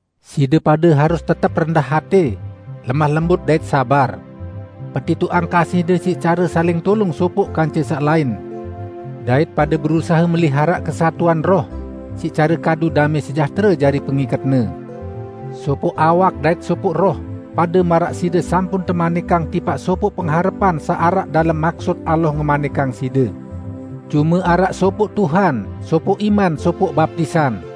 Side pade harus tetep rendah atẽ, lemah lembut, dait sabar. Petitoqang kasihde siq care saling tulung sopoq kance saq lain. Dait pade berusahe meliharaq kesatuan Roh siq care kadu damẽ sejahtere jari pengiketne: Sopoq awak, dait sopoq Roh, pade maraq side sampun temanikang tipaq sopoq pengharepan saq araq dalem maksut Allah ngemanikang side. Cume araq sopoq Tuhan, sopoq iman, sopoq baptisan,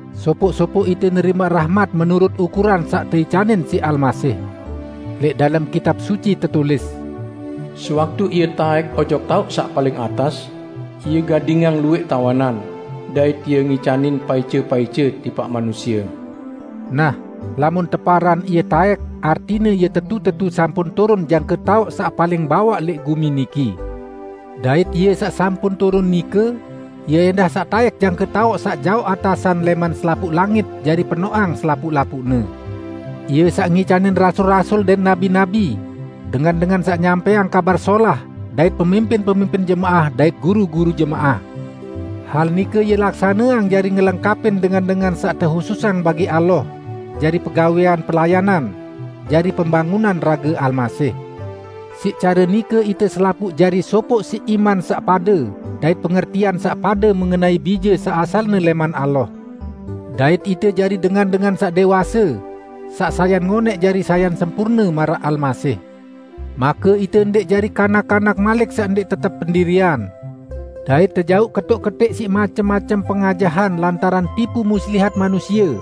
Sopoq-sopoq ite nerimaq rahmat menurut ukuran saq teicanin siq Almasih. Lẽq dalem Kitab Suci tetulis, "Sewaktu Ie taẽk ojok taoq saq paling atas, Ie gadingang luwẽq tawanan; dait Ie ngicanin paice-paice tipaq manusie." Nah, lamun teparan "Ie taẽk" artine Ie tetu-tetu sampun turun jangke taoq saq paling bawaq lẽq gumi niki. Dait Ie saq sampun turun nike, Ie ẽndah saq taẽk jangke taoq saq jaoq atasan lẽman selapuq langit jari penoqang selapuq-lapuqne. Ie saq ngicanin rasul-rasul dait nabi-nabi, dengan-dengan saq nyampẽang Kabar Solah dait pemimpin-pemimpin jemaah dait guru-guru jemaah. Hal nike Ie laksaneang jari ngelengkapin dengan-dengan saq tehususang bagi Allah jari pegawẽan pelayanan, jari pembangunan rage Almasih. Siq care nike ite selapuq jari sopoq siq iman saq pade dait pengertian saq pade mengenai Bije saq asalne lẽman Allah. Dait ite jari dengan-dengan saq dẽwase, saq sayan ngonẽq jari sayan sempurne maraq Almasih. Make ite ndẽq jari kanak-kanak malik saq ndẽq tetep pendirian dait tejauq ketoq-ketẽq siq macem-macem pengajahan lantaran tipu muslihat manusie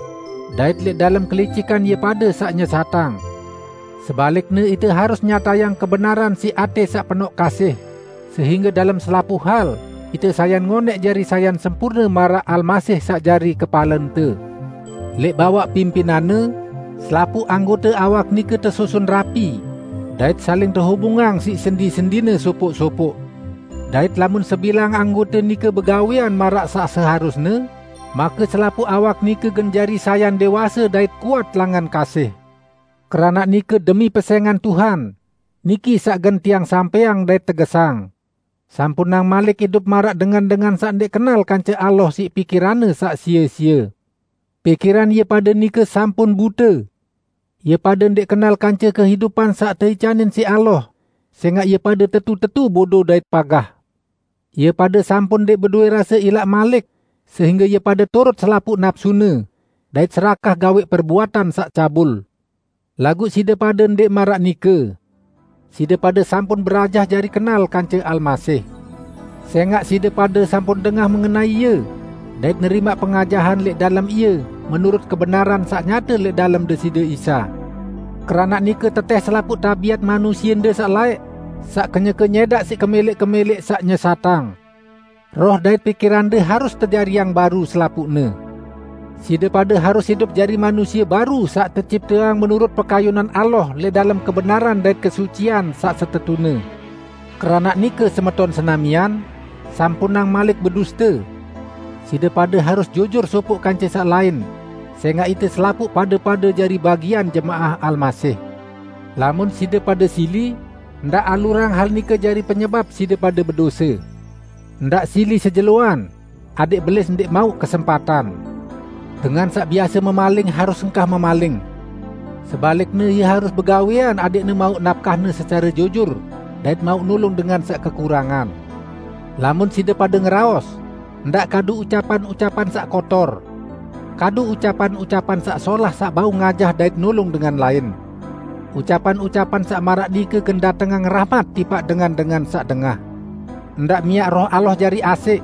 dait lẽq dalem kelicikan ie pade saq nyesatang. Sebalikne, ite harus nyatayang kebenaran siq atẽ saq penoq kasih, sehingge dalem selapuq hal ite sayan ngonẽq jari sayan sempurne maraq Almasih saq jari kepalente. Lẽq bawaq pimpinan-Ne, selapuq anggote awak nike tesusun rapi, dait saling tehubungang siq sendi-sendine sopoq-sopoq. Dait lamun sebilang anggote nike begawẽan maraq saq seharusne, make selapuq awak nike gen jari sayan dẽwase dait kuat langan kasih. Keranaq nike demi pesẽngan Tuhan, niki saq gen tiang sampẽang dait tegesang: Sampunang malik idup maraq dengan-dengan saq ndẽq kenal kance Allah siq pikiranne saq sie-sie. Pikiran ie pade nike sampun bute. Ie pade ndẽq kenal kance kehidupan saq teicanin siq Allah, sẽngaq ie pade tetu-tetu bodo dait pagah. Ie pade sampun ndẽq bedowẽ rase ilaq malik, sehingge ie pade turut selapuq napsune, dait serakah gawẽq perbuatan saq cabul. Laguq side pade ndẽq maraq nike. Side pade sampun berajah jari kenal kance Almasih. Sẽngaq side pade sampun dengah mengenai Ie dait nerimaq pengajahan lẽq dalem Ie menurut kebenaran saq nyate lẽq dalem Deside Isa. Keranaq nike tetẽh selapuq tabiat manusiende saq laẽq, saq kenyeke nyẽdaq siq kemẽlẽq-kemẽlẽq saq nyesatang. Roh dait pikirande harus tejariang baru selapuqne. Side pade harus idup jari manusie baru saq tecipteang menurut pekayunan Allah lẽq dalem kebenaran dait kesucian saq setetune. Keranaq nike semeton senamian, sampunang malik beduste. Side pade harus jujur sopoq kance saq lain, sẽngaq ite selapuq pade-pade jari bagian jemaah Almasih. Lamun side pade sili, ndaq alurang hal nike jari penyebap side pade bedose. Ndaq sili sejeloan, adẽq Belis ndẽq mauq kesempatan. Dengan saq biase memaling harus engkah memaling. Sebalikne ie harus begawẽan adẽqne mauq napkahne secare jujur dait mauq nulung dengan saq kekurangan. Lamun side pade ngeraos, ndaq kadu ucapan-ucapan saq kotor. Kadu ucapan-ucapan saq solah saq bau ngajah dait nulung dengan lain. Ucapan-ucapan saq maraq nike gen datengang rahmat tipaq dengan-dengan saq dengah. Ndaq miaq Roh Allah jari asẽq.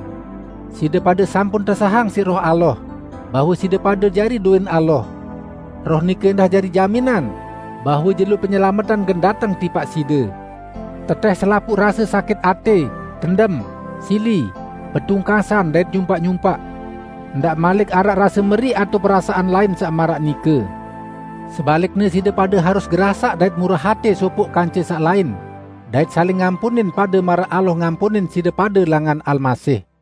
Side pade sampun tesahang siq Roh Allah bahwe side pade jari dowẽn Allah. Roh nike ẽndah jari jaminan bahwe jelo penyelametan gen dateng tipaq side. Tetẽh selapuq rase sakit atẽ, dendem, sili, betungkasan dait nyumpaq-nyumpaq. Ndaq malik araq rase meriq atao perasaan lain saq maraq nike. Sebalikne, side pade harus gerasaq dait murah atẽ sopoq kance saq lain, dait saling ngampunin pade maraq Allah ngampunin side pade langan Almasih.